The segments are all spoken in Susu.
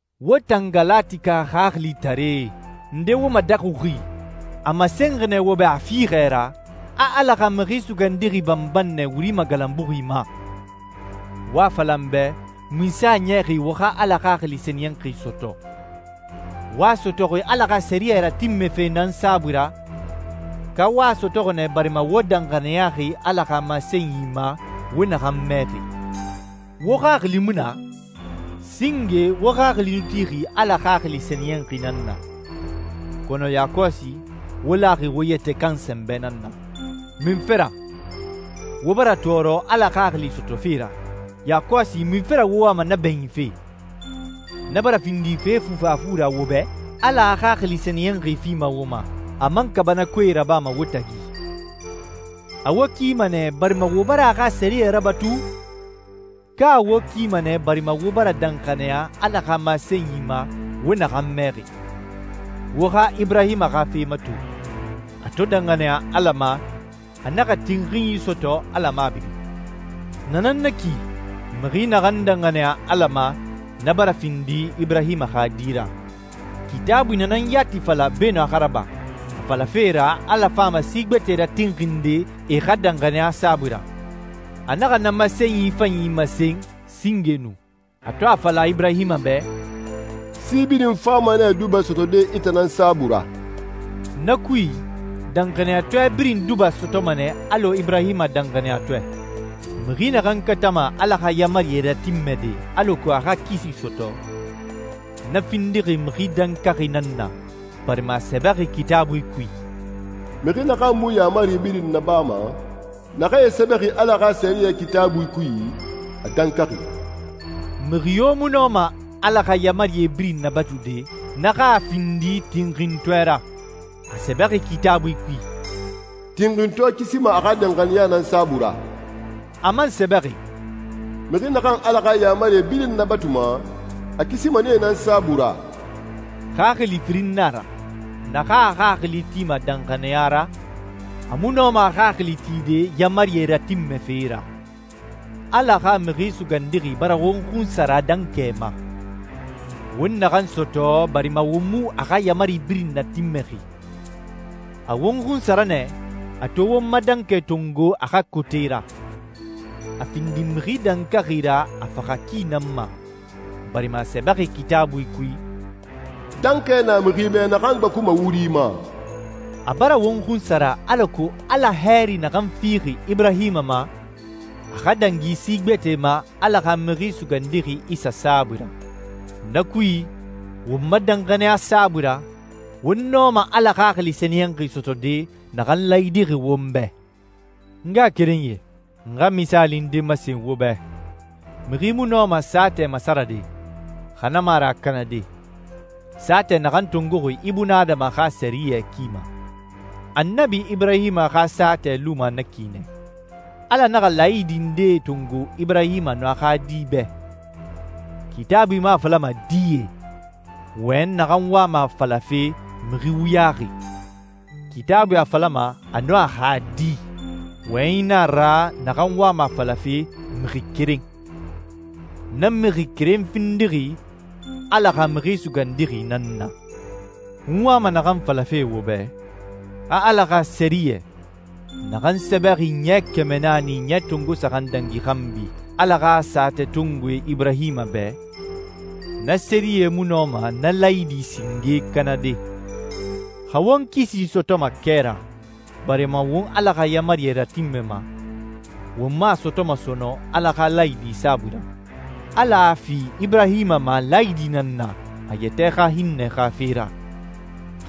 Wo tan Galatika xaxilitaree, nde wo madaxuxi? A masenxi nɛ wo bɛ a fiixɛ ra a Ala xa Mixi Sugandixi banban nɛ wuri magalanbuxi ma. Wo a fala n bɛ munse a niyaxi wo xa Ala Xaxili Sɛniyɛnxi sɔtɔ. Wo a sɔtɔxi Ala xa sɛriyɛ ratinmɛfe nan saabui ra, ka wo a sɔtɔxi nɛ barima wo danxaniyaxi Ala xa masenyi ma wo naxan mɛxi? Wo xaxili mu na? Singe wo xaxili nu tixi Ala Xaxili Sɛniyɛnxi nan na, kɔnɔ yakɔsi wo laxi wo yɛtɛ kan sɛnbɛ nan na. Munfe ra? Wo bara tɔɔrɔ Ala Xaxili sɔtɔfe ra, yakɔsi munfe ra wo wama na bɛɲinfe? Na bara findi fe fufafu ra wo bɛ? Ala a Xaxili Sɛniyɛnxi fima wo ma, a man kaabanakoe rabama wo tagi. A wo kima nɛ, barima wo bara a xa sɛriyɛe rabatu, ka a wo kima nɛ barima wo bara danxaniya Ala xa masenyi ma wo naxan mɛxi? Wo xa Iburahima xa fe mato. A to danxaniya Ala ma, a naxa tinxinyi sɔtɔ Ala mabiri. Na nan na ki, mixi naxan danxaniya Ala ma, na bara findi Iburahima xa di ra. Kitaabui na nan yati fala beenun a xa raba, a falafe ra Ala fama si gbɛtɛe ratinxinde e xa danxaniya saabui ra. A naxa na masenyi fanyi masen singe nu, a to a fala Iburahima bɛ, «Si birin fama nɛ duba sɔtɔde i tan saabui ra.» Na kui, danxaniyatɔɛ birin duba sɔtɔma nɛ alɔ Iburahima danxaniyatɔɛ. Mixi naxan katama Ala xa yaamarie ratinmɛde alako a xa kisi sɔtɔ, na findixi mixi dankaxi nan na, barima a sɛbɛxi Kitaabui kui, «Mixi naxan mu yaamari birin nabama, naxee sɛbɛxi Ala xa sɛriyɛ Kitaabui kui, a dankaxi.» Mixi yo mu nɔma Ala xa yaamarie birin nabatude, na xa a findi tinxintɔɛ ra. A sɛbɛxi Kitaabui kui, «Tinxintɔɛ kisima a xa danxaniya nan saabui ra.» A man sɛbɛxi, «Mixi naxan Ala xa yaamarie birin nabatuma, a kisima nee nan saabui ra.» Xaxili firin nan a ra. Naxan a xaxili tima danxaniya ra, a mu nɔma a xaxili tide yaamarie ratinmɛfe ra. Ala xa Mixi Sugandixi bara won xunsara dankɛ ma, won naxan sɔtɔ barima won mu a xa yaamari birin natinmɛxi. A won xunsara nɛ, a to won ma dankɛ tongo a xa kote ra. A findi mixi dankaxi ra a faxa ki nan ma, barima a sɛbɛxi Kitaabui kui, «Dankɛ na mixi bɛ naxan gbakuma wuri ma.» A bara won xunsara alako Ala hɛɛri naxan fixi Iburahima ma, a xa dangi si gbɛtɛe ma Ala xa Mixi Sugandixi Isa saabui ra. Na kui, won ma danxaniya saabui ra, won nɔma Ala Xaxili Sɛniyɛnxi sɔtɔde naxan laayidixi won bɛ. N ngaxakerenyie, n xa misaali nde masen wo bɛ. Mixi mu nɔma saatɛ masarade, xa na mu a ra a kanade, saatɛ naxan tongoxi ibunadama xa sɛriyɛ ki ma. Annabi Iburahima xa saatɛ luma na ki nɛ. Ala naxa laayidi ndee tongo Iburahima nun a xa di bɛ. Kitaabui mu a falama «die,» wɔyɛnyi naxan wama a falafe «mixi wuyaxi.» Kitaabui a falama «a nun a xa di.» Wɔyɛnyi na a ra naxan wama a falafe «mixi keren.» Na mixi keren findixi Ala xa Mixi Sugandixi nan na. N wama naxan falafe wo bɛ, a Ala xa sɛriyɛ, naxan sɛbɛxi ɲɛ kɛmɛ naani ɲɛ tongo saxan dangi xanbi Ala xa saatɛtongoe Iburahima bɛ, na sɛriyɛ mu nɔma na laayidi singe kanade. Xa won kisi sɔtɔma kɛ ra, barima won Ala xa yaamarie ratinmɛma, won mu a sɔtɔma sɔnɔn Ala xa laayidi saabui ra. Ala a fi Iburahima ma laayidi nan na a yɛtɛ xa hinnɛ xa fe ra.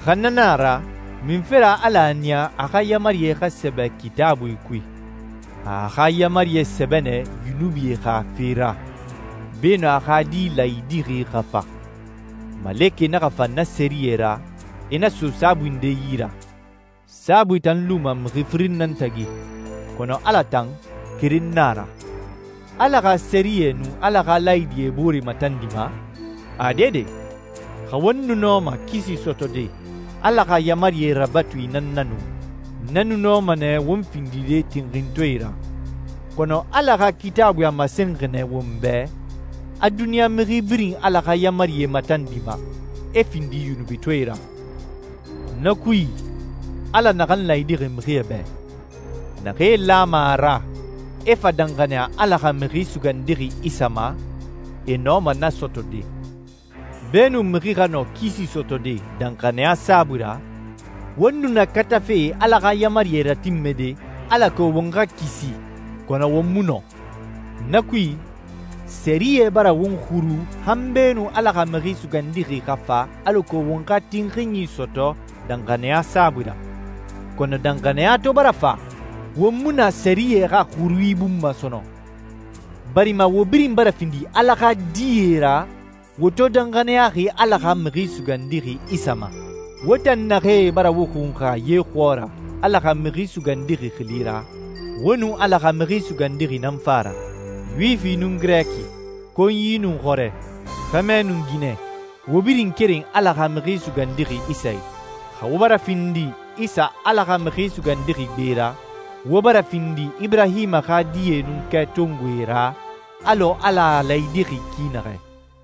Xa na nan a ra, munfe ra Ala a niya a xa yaamarie xa sɛbɛ Kitaabui kui? A a xa yaamarie sɛbɛ nɛ yunubie xa fe ra, beenun a xa Di laayidixi xa fa. Malekɛe naxa fa na sɛriyɛ ra, e na so saabui nde yi ra. Saabui tan luma mixi firin nan tagi, kɔnɔ Ala tan, keren nan a ra. Ala xa sɛriyɛ nun Ala xa laayidie e boore matandima? Ade de! Xa won nu nɔma kisi sɔtɔde Ala xa yaamarie rabatui nan na nu, na nu nɔma nɛ won findide tinxintɔɛe ra. Kɔnɔ Ala xa Kitaabui a masenxi nɛ won bɛ a duniɲa mixi birin Ala xa yaamarie matandima, e findi yunubitɔɛe ra. Na kui, Ala naxan laayidixi mixie bɛ, naxee lama a ra, e fa danxaniya Ala xa Mixi Sugandixi Isa ma, e nɔma na sɔtɔde. Beenun mixi xa nɔ kisi sɔtɔde danxaniya saabui ra, won nu na katafe Ala xa yaamarie ratinmɛde, alako won xa kisi, kɔnɔ won mu nɔ. Na kui, sɛriyɛ bara won xuru han beenun Ala xa Mixi Sugandixi xa fa alako won xa tinxinyi sɔtɔ danxaniya saabui ra. Kɔnɔ danxaniya to bara fa, won mu na sɛriyɛ xa xurui bun ma sɔnɔn, barima wo birin bara findi Ala xa die ra, wo to danxaniyaxi Ala xa Mixi Sugandixi Isa ma. Wo tan naxee bara wo xunxa ye xɔɔra Ala xa Mixi Sugandixi xili ra, wo nun Ala xa Mixi Sugandixi nan fa a ra. Yuwifi nun Girɛki, konyi nun xɔrɛ, xɛmɛ nun ginɛ, wo birin keren Ala xa Mixi Sugandixi Isa i. Xa wo bara findi Isa Ala xa Mixi Sugandixi gbe ra, wo bara findi Iburahima xa die nun kɛtongoe ra alɔ Ala a laayidixi ki naxɛ.